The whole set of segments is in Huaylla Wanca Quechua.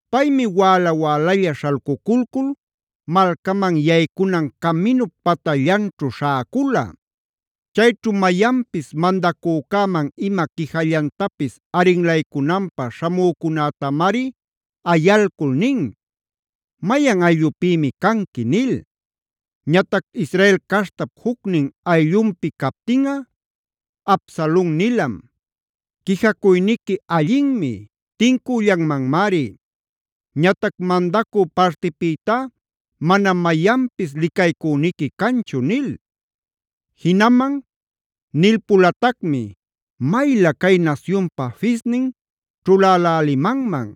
Paymi wäla-wälalla śhalcuculcul malcaman yaycunan caminup patallanćhu śhäcula. Chayćhu mayanpis mandacücäman ima quijallantapis arinlaycunanpä śhamücunätamari ayalcul nin: “¿Mayan ayllupïmi canqui?” nil. Ñatac Israel caśhtap jucnin ayllunpi captinꞌa, Absalon nilam: “Quijacuyniqui allinmi; tincüllanmanmari. Ñatac mandacü partipïtá manam mayanpis licaycüniqui canchu” nil. Jinaman nilpulatacmi: “¡Maylä cay nasyunpä fisnin ćhulälälimanman!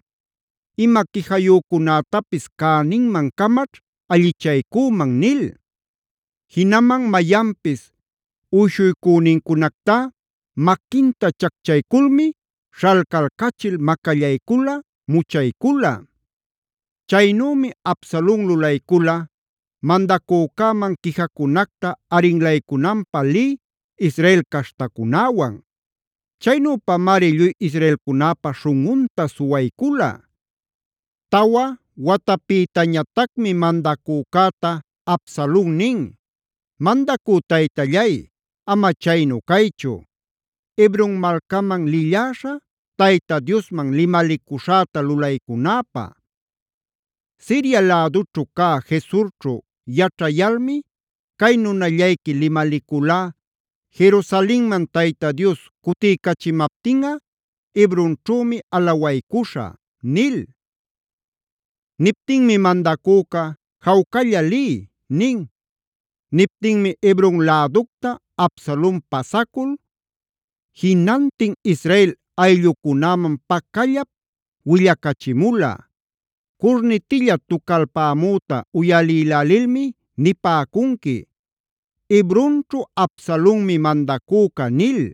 Ima quijayücunätapis cäninman-camaćh allichaycüman” nil. Jinaman mayanpis uyshuycünincunactá maquinta chacchayculmi śhalcalcachil macallaycula, muchaycula. Chaynümi Absalon lulaycula mandacücäman quijacunacta arinlaycunanpä lï Israel caśhtacunäwan. Chaynüpamari lluy israelcunäpa śhunꞌunta suwaycula. Tawa watapïtañatacmi mandacücäta Absalon nin: “Mandacü taytallay, ama chaynu caychu, Hebron malcaman lilläśhä Tayta Diosman limalicuśhäta lulaycunäpä. Siria lädućhu cä Gesurćhu yaćhayalmi cay nunallayqui limaliculá: ‘Jerusalenman Tayta Dios cutiycachimaptinꞌa Hebronćhümi alawaycuśhä’” nil. Niptinmi mandacüca: “Jawcalla liy” nin. Niptinmi Hebron läducta Absalon pasacul, jinantin Israel ayllucunäman pacallap willacachimula: “Curnitilla tucalpamüta uyalïlälilmi nipäcunqui: ‘¡Hebronćhu Absalonmi mandacüca!’” nil.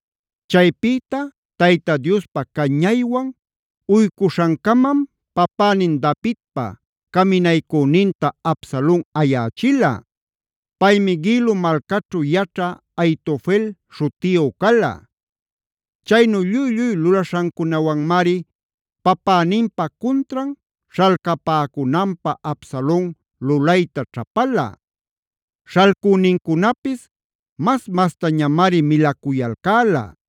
Chaypïta Tayta Diospa cañaywan uycuśhancamam papänin Davidpa caminaycüninta Absalon ayächila. Paymi Gilo malcaćhu yaćhä Ahitofel śhutiyu cala. Chaynu lluy-lluy lulaśhancunawanmari papäninpä cuntran śhalcapäcunanpä Absalon lulayta ćhapala; śhalcünincunapis mas-mastañamari milacuyalcäla.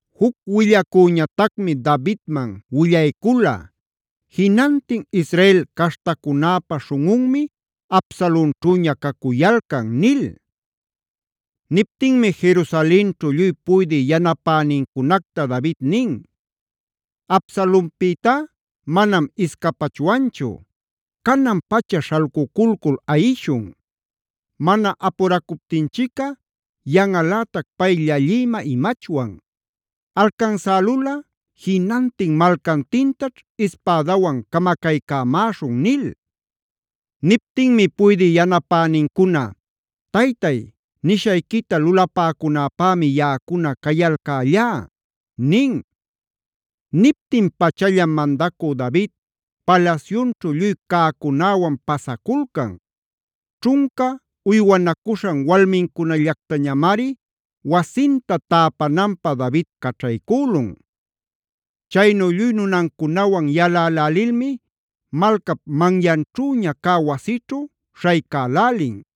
Juc willacüñatacmi Davidman willaycula: “Jinantin Israel caśhtacunäpä śhunꞌunmi Absalonćhüña cacuyalcan” nil. Niptinmi Jerusalenćhu lluy puydï yanapänincunacta David nin: “Absalonpïtá manam iscapachwanchu. Canan-pacha śhalcuculcul ayishun. Mana apuracuptinchicꞌa yanꞌalätac pay llallïmä imachwan. Alcansälulꞌa jinantin malcantintaćh ispädawan camacaycämaśhun” nil. Niptinmi puydï yanapänincuna: “Taytay, nishayquita lulapäcunäpämi yaꞌacuna cayalcällá” nin. Niptin-pachallam mandacü David palasyunćhu lluy cäcunäwan pasaculcan. Ćhunca uywanacuśhan walmincunallactañamari wasinta täpananpä David caćhaycülun. Chaynu lluy nunancunawan yalälälilmi malcap manyanchüña cä wasićhu śhaycälälin.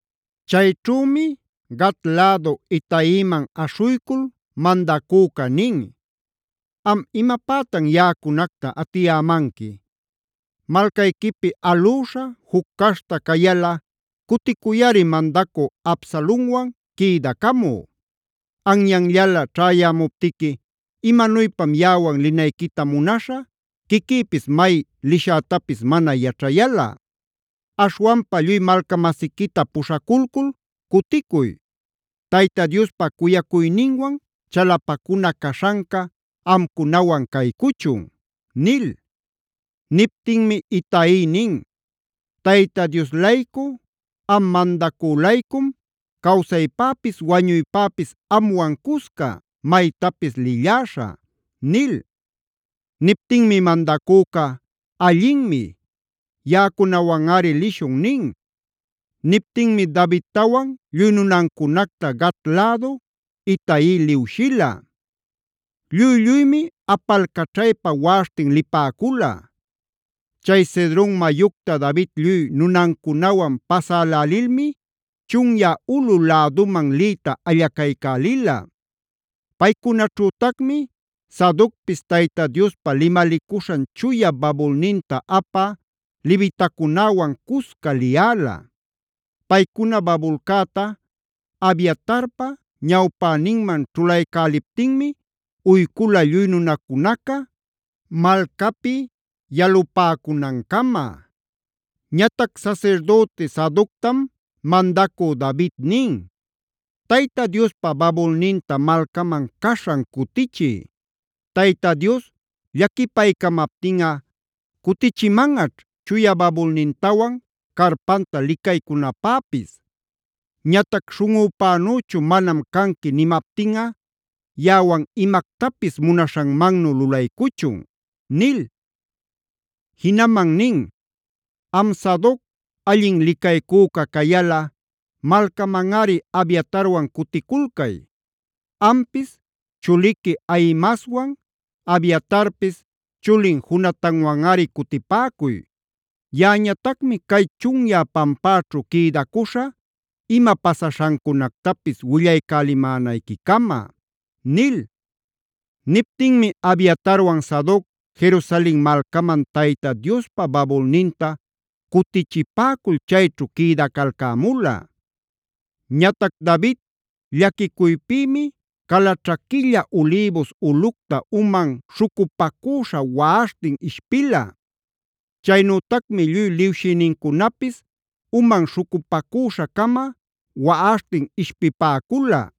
Chayćhümi Gat lädu Itaiman aśhuycul mandacüca nin: “¿Am imapätan yaꞌacunacta atiyämanqui? Malcayquipi alüśha, juc caśhta cayalꞌa cuticuyꞌari mandacü Absalonwan quïdacamü. Anyanllala ćhäyämuptiqui ¿imanuypam yaꞌawan linayquita munaśha, quiquïpis may lishätapis mana yaćhayalꞌa? Aśhwanpa lluy malca-masiquita puśhaculcul cuticuy. ¡Tayta Diospa cuyacuyninwan chalapacuna caśhanca amcunawan caycuchun!” nil. Niptinmi Itai nin: “¡Tayta Dios-laycu, am mandacü-laycum cawsaypäpis wañuypäpis amwan cusca maytapis lilläśhä!” nil. Niptinmi mandacüca: “Allinmi. Yaꞌacunawanꞌari lishun” nin. Niptinmi Davidtawan lluy nunancunacta Gat lädu Itai liwshila. Lluy-lluymi apalcaćhaypa waꞌaśhtin lipäcula. Chay Cedron mayucta David lluy nunancunawan pasälälilmi chunyä ulꞌu läduman liyta allacaycälila. Paycunaćhütacmi Sadocpis Tayta Diospa limalicuśhan chuya babulninta apä levitacunäwan cusca liyäla. Paycuna babulcäta Abiatarpa ñawpäninman ćhulaycäläliptinmi uycula lluy nunacunaca malcapi yalupäcunan-cama. Ñatac sasirdüti Sadoctam mandacü David nin: “Tayta Diospa babulninta malcaman caśhan cutichiy. Tayta Dios llaquipaycamaptinꞌa cutichimanꞌaćh chuya babulnintawan carpanta licaycunapäpis. Ñatac ‘śhunꞌüpänüchu manam canqui’ nimaptinꞌa yaꞌawan imactapis munaśhanmannu lulaycuchun” nil. Jinaman nin: “Am Sadoc allin licaycüca cayalꞌa malcamanꞌari Abiatarwan cuticulcay. Ampis chuliqui Ahimaaswan, Abiatarpis chulin Jonatanwanꞌari cutipäcuy. Yaꞌañatacmi cay chunyä pampäćhu quïdacuśhä ima pasaśhancunactapis willaycälimänayqui-cama” nil. Niptinmi Abiatarwan Sadoc Jerusalen malcaman Tayta Diospa babulninta cutichipäcul chayćhu quïdacalcämula. Ñatac David llaquicuypïmi calaćhaquilla Olivos ulꞌucta uman śhucupacüśha waꞌaśhtin ishpila. Chaynütacmi lluy liwshïnincunapis uman śhucupacüśha-cama waꞌaśhtin ishpipäcula.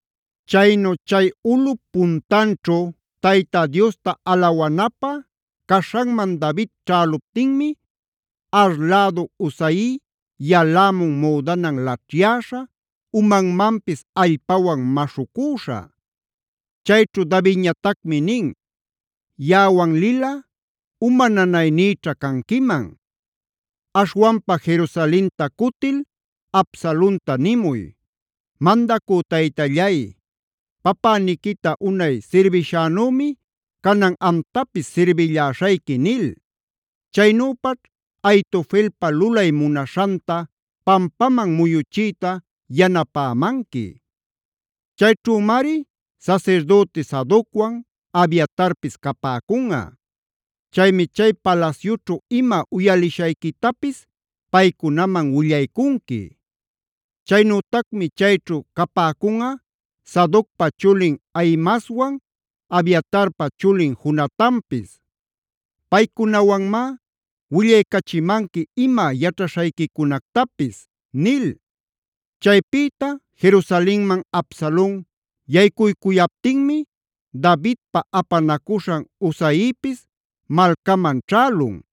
Chaynu chay ulꞌup puntanćhu Tayta Diosta alawanapä caśhanman David ćhäluptinmi Ar lädu Husai yalämun müdanan laćhyäśha, umanmanpis allpawan maśhucüśha. Chayćhu Davidñatacmi nin: “Yaꞌawan lilꞌa uma nanaynïćha canquiman. Aśhwanpa Jerusalenta cutil Absalonta nimuy: ‘Mandacü taytallay, papäniquita unay sirbishänümi canan amtapis sirbilläśhayqui’ nil. Chaynüpaćh Ahitofelpa lulay munaśhanta pampaman muyuchiyta yanapämanqui. Chayćhümari sasirdüti Sadocwan Abiatarpis capäcunꞌa. Chaymi chay palasyućhu ima uyalishayquitapis paycunaman willaycunqui. Chaynütacmi chayćhu capäcunꞌa Sadocpa chulin Ahimaaswan, Abiatarpa chulin Jonatanpis. Paycunawanmá willaycachimanqui ima yaćhaśhayquicunactapis” nil. Chaypïta Jerusalenman Absalon yaycuycuyaptinmi Davidpa apanacuśhan Husaipis malcaman ćhälun.